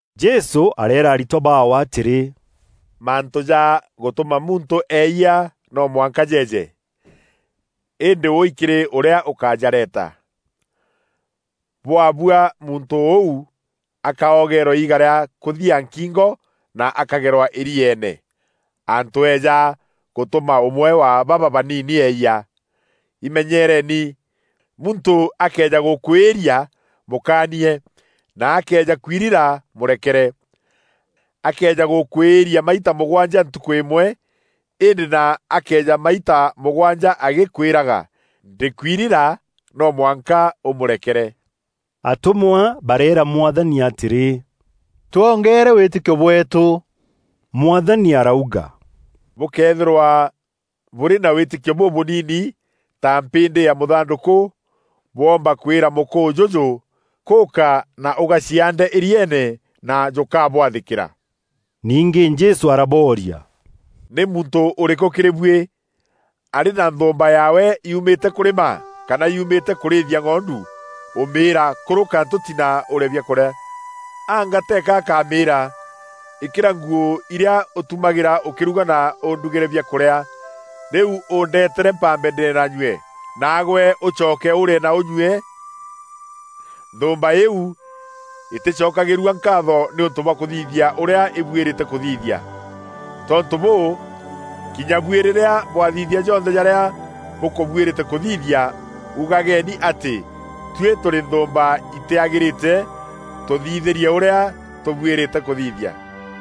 Jesû areera aritwa baawe atîrî, “Mantû ja gûtûma muntû eeyia no mwanka jeeje. Îndî wûi kîrî ûrîa ûkajareta! Bwabua muntû ûu akaogeerwa iiga rîa kûthia nkingo na akagerwa îrieene, antû eeja gûtûma ûmwe wa baba baniini eeyia. Imenyeereni! Muntû akëeja gûkwîîria, mûkaanie; na akëeja kwirira mûrekere. Akëeja gûkwîîria maita mûgwanja ntukû îmwe, îndî na akeeja maita mûgwanja agîkwîraga, ‘Ndîkwirira,’ no mwanka ûmûrekere.” Atûmwa bareera Mwathani atîrî, “Twongeere wîtîkio bweetû!” Mwathani arauga, “Bûkëethîrwa bûrî na wîtîkio bûbûnini ta mpîndî ya mûthandûkû, bwoomba kwîra mûkûû jûjû: ‘Kûûka na ûgaciaande îrieene,’ na jûkabwathîkîra.” Ningî Jesû arabooria, “Nî muntû ûrîkû kîrî buî, arî na nthûûmba yaawe yuumîte kûrima kana yuumîte kûrîîthia ng'ondu, ûmîîra ‘Kûrûka ntûti na ûrîe biakûrîa?’ Anga teeka akamîîra, ‘Îkîra nguû irîa ûtumagîra ûkîruga na ûndugîre biakûrîa. Rîu ûndeetere mpambe ndîe na nyue, naagwe ûcoke ûrîe na ûnyue?’ Nthûûmba îîu îtîcokagîrua nkaatho nîûntû bwa kûthithia ûrîa îbuîrîte kûthithia. Tontû bûû, kinya buî rîrîa bwathithia jonthe jarîa bûkûbuîrîte kûthithia, ugageni atî, ‘Tuî tûrî nthûûmba itîagîrîte, tûthithîrie ûrîa tûbuîrîte kûthithia.’”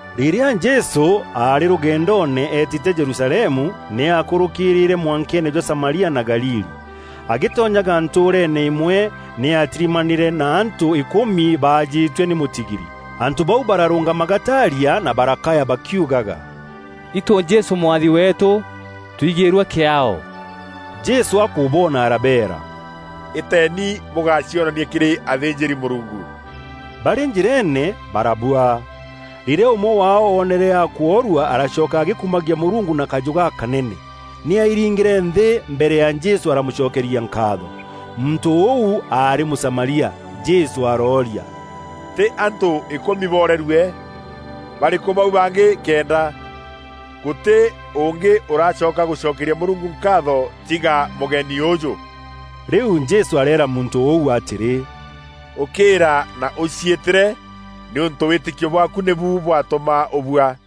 Rîrîa Jesû aarî rûgendoone eetîte Jerusalemu, nî aakûrûkîrîîre mwankeene jwa Samaria na Galili. Agîtonyaga ntûûreene îmwe nî aatirimanîre na antû îkûmi baajîtue nî mûtigiri. Antû bau bararûngama gataaria na barakaya bakiugaga, “Itû Jesû Mwathi weetû, twigîîrue kîaao.” Jesû akûboona arabeera, “Îteeni bûgacionanie kîrî athînjîri-Mûrungu.” Barî njîreene barabua. Rîrîa ûmwe waao oonere akworua aracoka agîkumagia Mûrungu na kajû gakanene. Nî aairingîre nthî mbere ya Jesû aramûcokeria nkaatho. Muntû ûu aarî Mûsamaria. Jesû arooria, “Tî antû îkûmi boorerue? Barîkû bau bangî kenda? Gûtî ûngî ûracoka gûcokeria Mûrungu nkaatho, tiga mûgeni ûûjû.” Rîu Jesû areera muntû ûu atîrî, “Ûkîîra na ûciîtîre nîûntû wîtîkio bwaaku nîbu bwatûma ûbua.”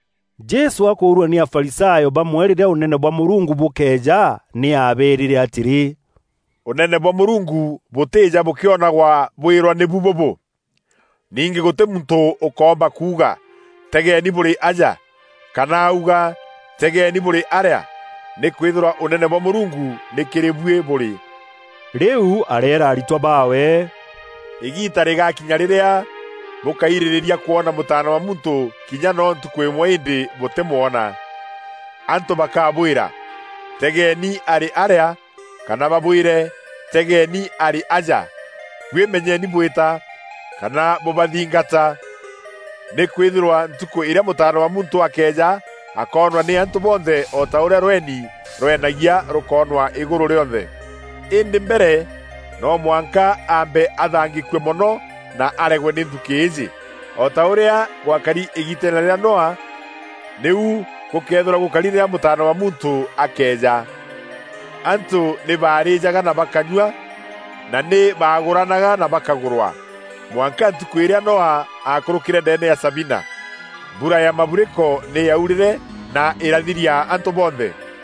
Jesû akûûrua nî Afarisayo bamwe rîrîa Ûnene bwa Mûrungu bûkeeja, nî aabeerîre atîrî, “Ûnene bwa Mûrungu bûtîîja bûkionagwa bwîrwa nîbu bûbû! Ningî gûtî muntû ûkoomba kuuga, ‘Tegeeni bûrî aja!’ Kana auga, ‘Tegeeni bûrî arîa!’ Nîkwîthîrwa Ûnene bwa Mûrungu nî kîrî buî bûrî.” Rîu areera aritwa baawe, “Îgiita rîgakinya rîrîa bûkairîrîria kwona Mûtaana wa Muntû kinya noo ntukû îmwe îndî bûtîmwona. Antû bakabwîra, ‘Tegeeni arî arîa!’ Kana babwîre, ‘Tegeeni arî aja!’ Buî menyeni bwîta, kana bûbathingata. Nîkwîthîrwa ntukû îrîa Mûtaana wa Muntû akeeja akoonwa nî antû bonthe o ta ûrîa rweni rwenagia rûkoonwa îgûrû rîonthe. Îndî mbere no mwanka aambe athangîkue mono na aregwe nî nthukî îîjî. O ta ûrîa gwakari îgiiteene rîa Noa, nîu gûkeethîrwa gûkari rîrîa Mûtaana wa Muntû akeeja. Antû nî baarîîjaga na bakanyua, na nî baagûranaga na bakagûrwa, mwanka ntukû îrîa Noa aakûrûkîre ndeene ya sabina. Mbura ya maburiko nî yaurîre na îrathiria antû bonthe.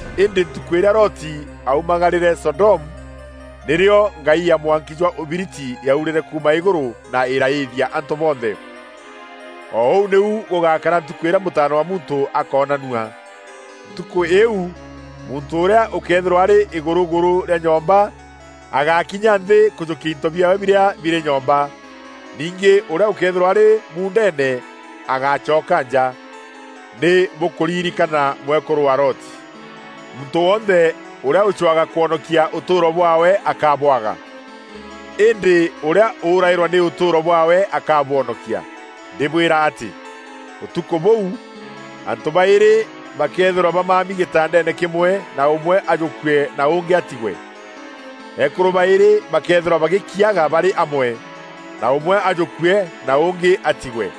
Îndî ntukû îrîa Loti aaumagarîre Sodomu, nîrîo ngai ya mwanki jwa ûbiriti yaurîre kuuma îgûrû na îraîthia antû bonthe. O ûu nîu gûgakara ntukû îrîa Mûtaana wa Muntû akoonanua. Ntukû îîu muntû ûrîa ûkeethîrwa arî îgûrûgûrû rîa nyomba, agákinya nthî kûjûkia into biaawe birîa birî nyomba. Ningî ûrîa ûkeethîrwa arî muundeene, agácoka nja. Nî bûkûririkana mwekûrû wa Loti! Muntû wonthe ûrîa ûcwaga kwonokia ûtûûro bwaawe akabwaga. Îndî ûrîa ûraîrwa nî ûtûûro bwaawe akabwonokia. Ndîbwîra atî, ûtukû bûu, antû baîrî bakeethîrwa bamami gîtandeene kîmwe na ûmwe ajûkue na ûngî atigwe. Eekûrû baîrî bakeethîrwa bagîkiaga barî amwe, na ûmwe ajûkue na ûngî atigwe. [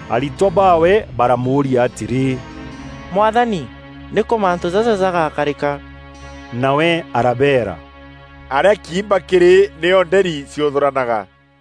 Aritwa baawe baramûûria atîrî, “Mwathani, nîkû mantû jaja jagakarîka?” Nawe arabeera, “Arîa kiimba kîrî, nîo nderi ciûthûranaga.”